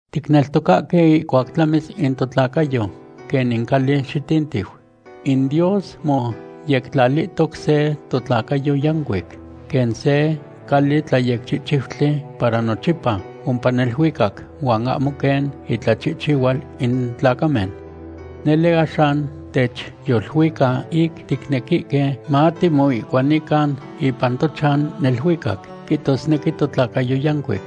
Ticneltocahque ihcuac tlamis in totlacayo quen in cali xitintiu, in Dios moyectlalihtoc se totlacayo yancuic, quen se cali tlayecchihchiutli para nochipa ompa neluicac, huan ahmo quen intlachihchihual in tlacamen. Nele, axan techyoluica ic ticnequihque matimoihcuanican ipan tochan neluicac, quihtosnequi totlacayo yancuic.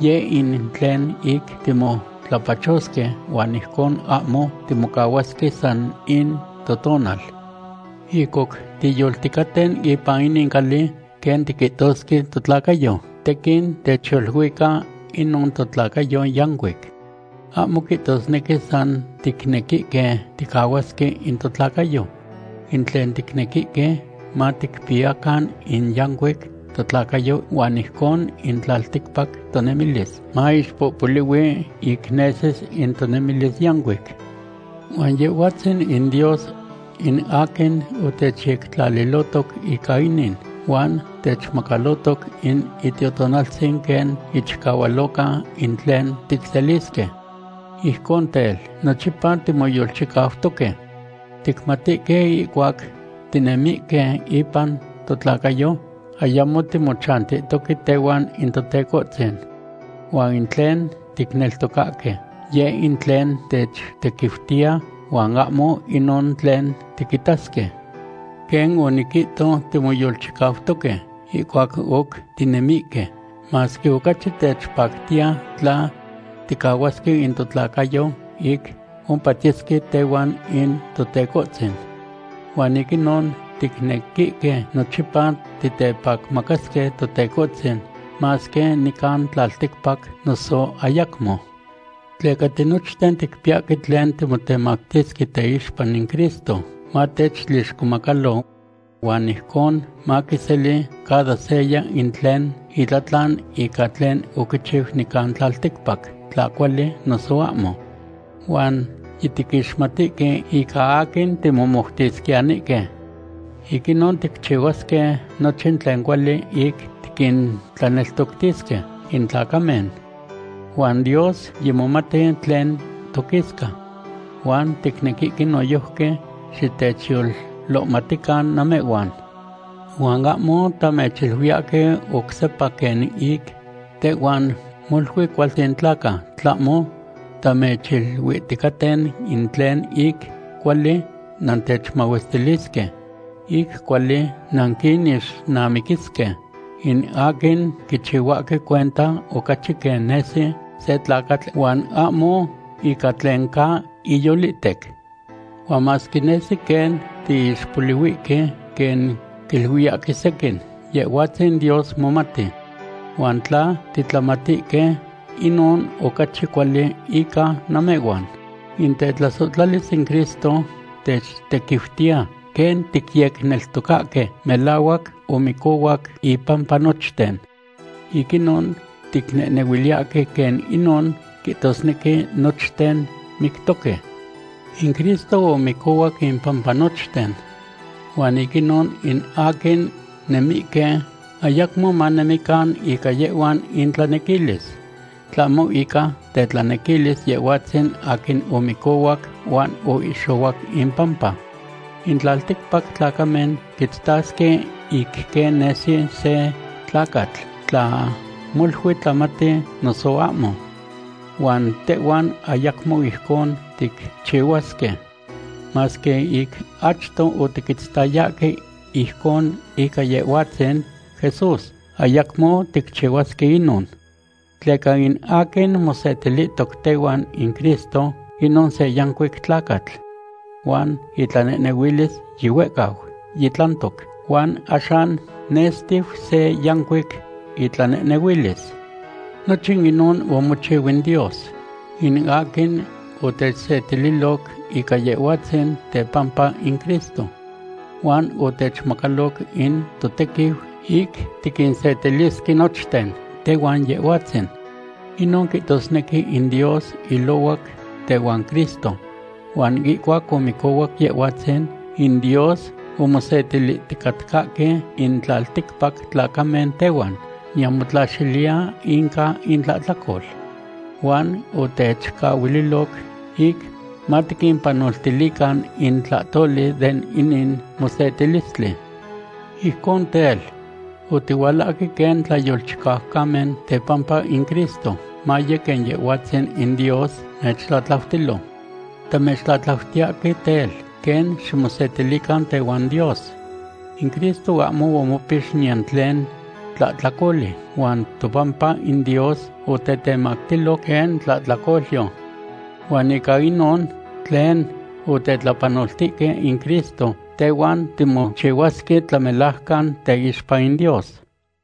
Yeh in tlen ic timotlapachosque huan ijcon ahmo timocahuasque san in totonal. Ic oc tiyolticaten ipan inin cali, quen tiquihtosque totlacayo, tequin techyoluica inon totlacayo yancuic. Ahmo quihtosnequi san ticnequihque ticahuasque in totlacayo. In tlen ticnequihque maticpiyacan in yancuic totlacayo huan ijcon in tlalticpac tonemilis moixpohpolihui ic nesis in tonemilis yancuic. Huan Yehhuatzin in Dios in aquin otechyectlalilohtoc ica inin, huan techmacalohtoc in Itiotonaltzin quen ichicahualoca in tlen ticselisque. Ijcon tel, nochipa timoyolchicautoque. Ticmatihque ihcuac tinemihque ipan totlacayo, ayamo timochantihtoque tehuan in Totecohtzin. Huan in tlen ticneltocahque, yeh in tlen techtequiutiya, huan ahmo inon tlen tiquitasque. Quen oniquihto, timoyolchicautoque, ihcuac oc tinemihque, masque ocachi techpactiya tla ticahuasque in totlacayo ic ompatiyesque tehuan in Totecohtzin. Huan ic inon ticnequihque nochipa titepacmacasque Totecohtzin, masque nican tlalticpac noso ayacmo. Tleca tinochten ticpiyahque tlen timotemactisque teixpa in Cristo, matechtlixcomacalo. Huan ijcon maquiseli cada seya in tlen itlatlan ica tlen oquichiu nican tlalticpac, tla cuali noso ahmo. Huan yitiquixmatihque ica aquin timomoutisquiyanihque. Ic inon ticchihuasque nochin tlen cuali ic tiquintlaneltoctisque in tlacamen. Huan Dios yimomati tlen toquisca. Huan ticnequihque noyojqui xitechyolohmatican namehhuan. Huan ahmo tamechiluiyahque oc sepa quen ic tehhuan molui cualtzin tlaca, tlahmo tamechiluihticaten in tlen ic cuali nantechmahuestilisque, ic cuali nanquinixnamiquisque in aquin quichihuahque cuenta ocachi quen nesi se tlacatl huan ahmo ica tlen ca iyolihtec. Huan masque nesi quen tiixpolihuihque quen quiluiyahque sequin, Yehhuatzin Dios momati. Huan tla titlamatihque, inon ocachi cuali ica namehhuan. In tetlasohtlalis in Cristo techtequiutiya, quen ticyecneltocahque melahuac omicohuac impampa nochten. Ic inon ticnehnehuiliyahque quen inon quihtosnequi nochten mictoque. In Cristo omicohuac impampa nochten, huan ic inon in aquin nemihque, ayacmo manemican ica yehhuan intlanequilis, tlahmo ica tetlanequilis Yehhuatzin aquin omicohuac huan oihxohuac impampa. In tlalticpac tlacamen quitztasque ic quen nesi se tlacatl, tla molui tlamati noso ahmo. Huan tehhuan ayacmo ijcon ticchihuasque. Masque ic achto otiquitztayahque ijcon ica Yehhuatzin Jesús, ayacmo ticchihuasque inon. Tleca in aquin mosetilihtoc tehuan in Cristo, inon se yancuic tlacatl. Huan itlanehnehuilis yihuehcau yitlantoc, huan axan nextiu se yanciuc itlanehnehuilis. Nochin inon omochiu in Dios, in aquin otechsetililoc ica Yehhuatzin tepampa in Cristo. Huan otechmacaloc in totequiu ic tiquinsetilisque nochten tehuan Yehhuatzin. Inon quihtosnequi in Dios ilohuac tehuan Cristo huan ihcuac omicohuac Yehhuatzin, in Dios omosetilihticatcahque in tlalticpac tlacamen tehuan, niyan motlaxiliya inca intlahtlacol. Huan otechcahuililoc ic matiquimpanoltilican in tlahtoli de inin mosetilistli. Ijcon tel, otihualahque quen tlayolchicaucamen tepampa in Cristo, maye quen Yehhuatzin in Dios mechtlatlautilo. Tamechtlatlautiyahque tel, quen ximosetilican tehuan Dios. In Cristo ahmo omopix niyan tlen tlahtlacoli, huan topampa in Dios otetemactilo quen tlahtlacolyo. Huan ica inon tlen otetlapanoltihque in Cristo, tehhuan timochihuasque tlamelajcan teixpa in Dios.